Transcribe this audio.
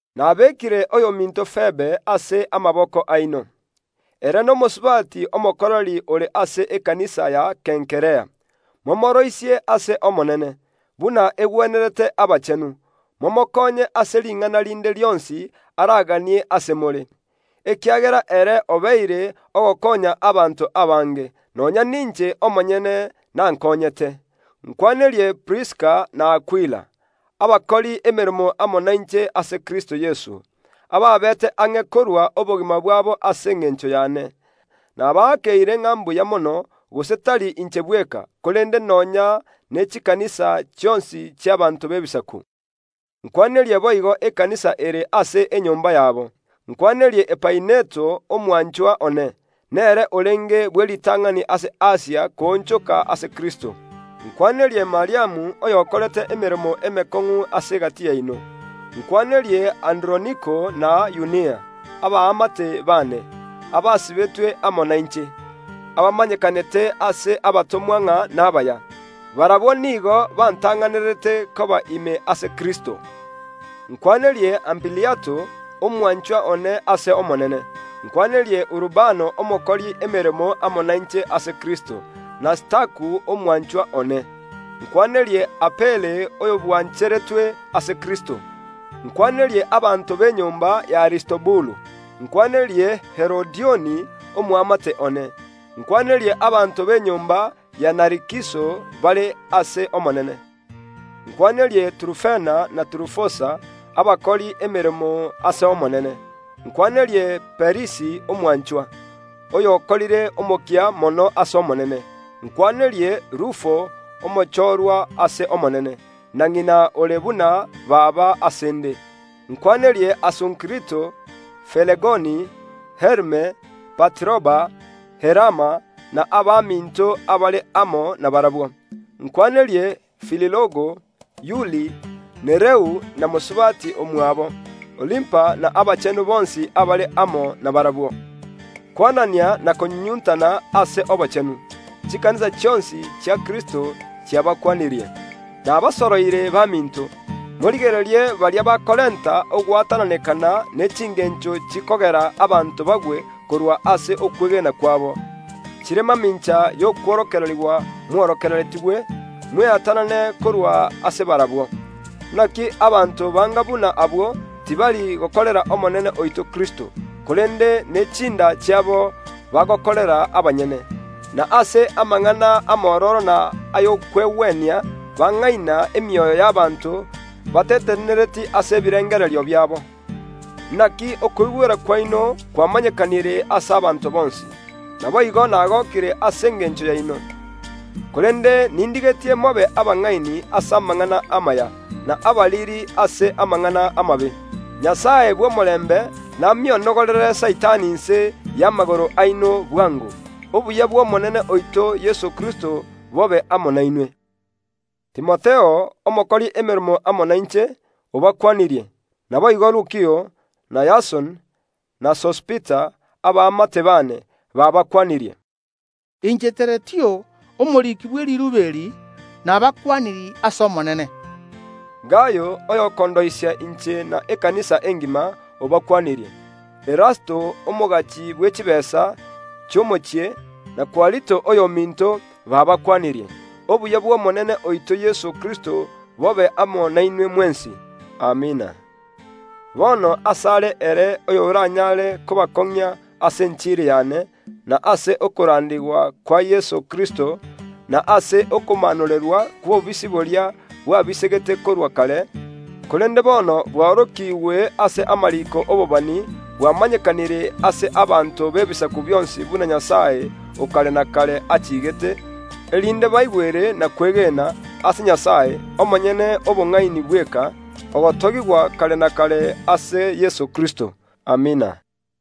Nabekire oyominto Febe ase amaboko aino. Ere nomosubati omokoreri ore ase ekanisa gia Kenkrea. Momooroisie ase Omonene, buna egwenerete abachenu, momokonye ase ring’ana rinde rionsi araganie ase more, ekiagera ere obeire ogokonya abanto abange, nonya ninche omonyene nankonyete. Nkwanerie Priskila na Akwila, abakori emeremo amo nainche ase Kristo Yeso, ababete ang’e korua obogima bwabo ase engencho y’ane. Nabaakeire ng’a mbuya mono, gose tari inche bweka, korende nonya n’Ebirisia bionsi bi’abaanto b’Ebisaku. Nkwanerie boigo ekanisa kere ase enyomba yabo. Nkwanerie Epaineto omwanchwa one, nere orenge bw’eritang’ani ase Asia koonchoka ase Kristo. Nkwanerie Mariamu oyokorete emeremo emekong’u ase egati yaino. Nkwanerie Androniko na Yunia, abaamate baane, abasibetwe ano nainche, abatomwa bagwatorwa ng’a nabaya; barabwo nigo bantang’anerete koba ime ase Kristo. Nkwanerie Ampiliato, omwanchwa one ase Omonene. Nkwanerie Urubano omokori emeremo amo nainche ase Kristo, na Staku omwanchwa one. Nkwanerie Apele oyo bwancheretwe ase Kristo. Nkwanerie abanto b’enyomba y’Aristobulu. Nkwanerie Herodioni, omoamate one. Nkwanerie abanto b’enyomba ya Narikiso bare ase Omonene. Nkwanerie Turufena na Turufosa, abakori emeremo ase Omonene. Nkwanerie Perisi omwanchwa, oyokorire omokia mono ase Omonene. Nkwanerie Rufo omochorwa Omonene, na ng’ina ore buna baba ase ’nde. Nkwanerie Asunkrito, Felegoni, Herme, Patiroba, Herama na abaminto abare amo nabarabwo. Nkwanerie Fililogo, Yuli, Nereu na mosubati omwabo, Olimpa na abachenu bonsi abare amo n’abarabwo. Kwanania inwe ase inwe ase okonyunyuntana. Chikanisa chionsi chia Kristo chiabakwanirie. Nabasoroire baminto, morigererie baria bakorenta ogwatananekana ne chingencho chikogera abanto bagwe korwa ase okwegena kwabo, chire mamincha y’okworokererigwa mworokereretigwe; mweatanane korwa ase barabwo. Inaki abanto banga buna abwo tibari gokorera Omonene oito Kristo, korende nechinda chiabo bagokorera abanyene; na ase amang’ana amororo na ay’okwegwenia bang’aina emioyo y’ abanto batetenenereti ase ebirengererio biabo. Inaki oboigweri bwaino bwamanyekanire ase abanto bonsi. Naboigo nagokire ase engencho yaino, korende nindigetie mobe abang’aini ase amang’ana amaya, na abariri ase amang’ana amabe. Nyasae bw’omorembe namionogorere Saitani inse y’amagoro aino bwango. Obuya bw’Omonene oito Yeso Kristo bobe amo nainwe. Timotheo, omokori emeremo amo nainche, obakwanirie; naboigo Lukio, na Yasoni, na Sosipateri, abaamate bane, baabakwanirie. Inche Teretio, omoriki bwe riirube eri, nabakwanirie ase Omonene. Gayo, oyokondoisia inche na ekanisa engima, baabakwanirie. Erasto, omogachi bwe chitaabu, chi’omochie, na Kwarito oyominto, baabakwanirie. Obuya bw’Omonene oito Yeso Kristo bobe amo nainwe mwensi. Amina. Bono ase are ere oyoranyare kobakong’ia ase enchiri y’ane, na ase okorandigwa kwa Yeso Kristo, na ase okomaanorerwa kw’obobisi boria bwabisegete korwa kare, korende bono bwaorokiigwe ase amariiko y’ababani, bwamanyekanire ase abanto b’ebisaku bionsi buna Nyasae o kare na kare achiigete, erinde baigwere na kwegena, ase Nyasae, omonyene obong’aini bweka, ogotogigwa kare na kare ase Yeso Kristo! Amina.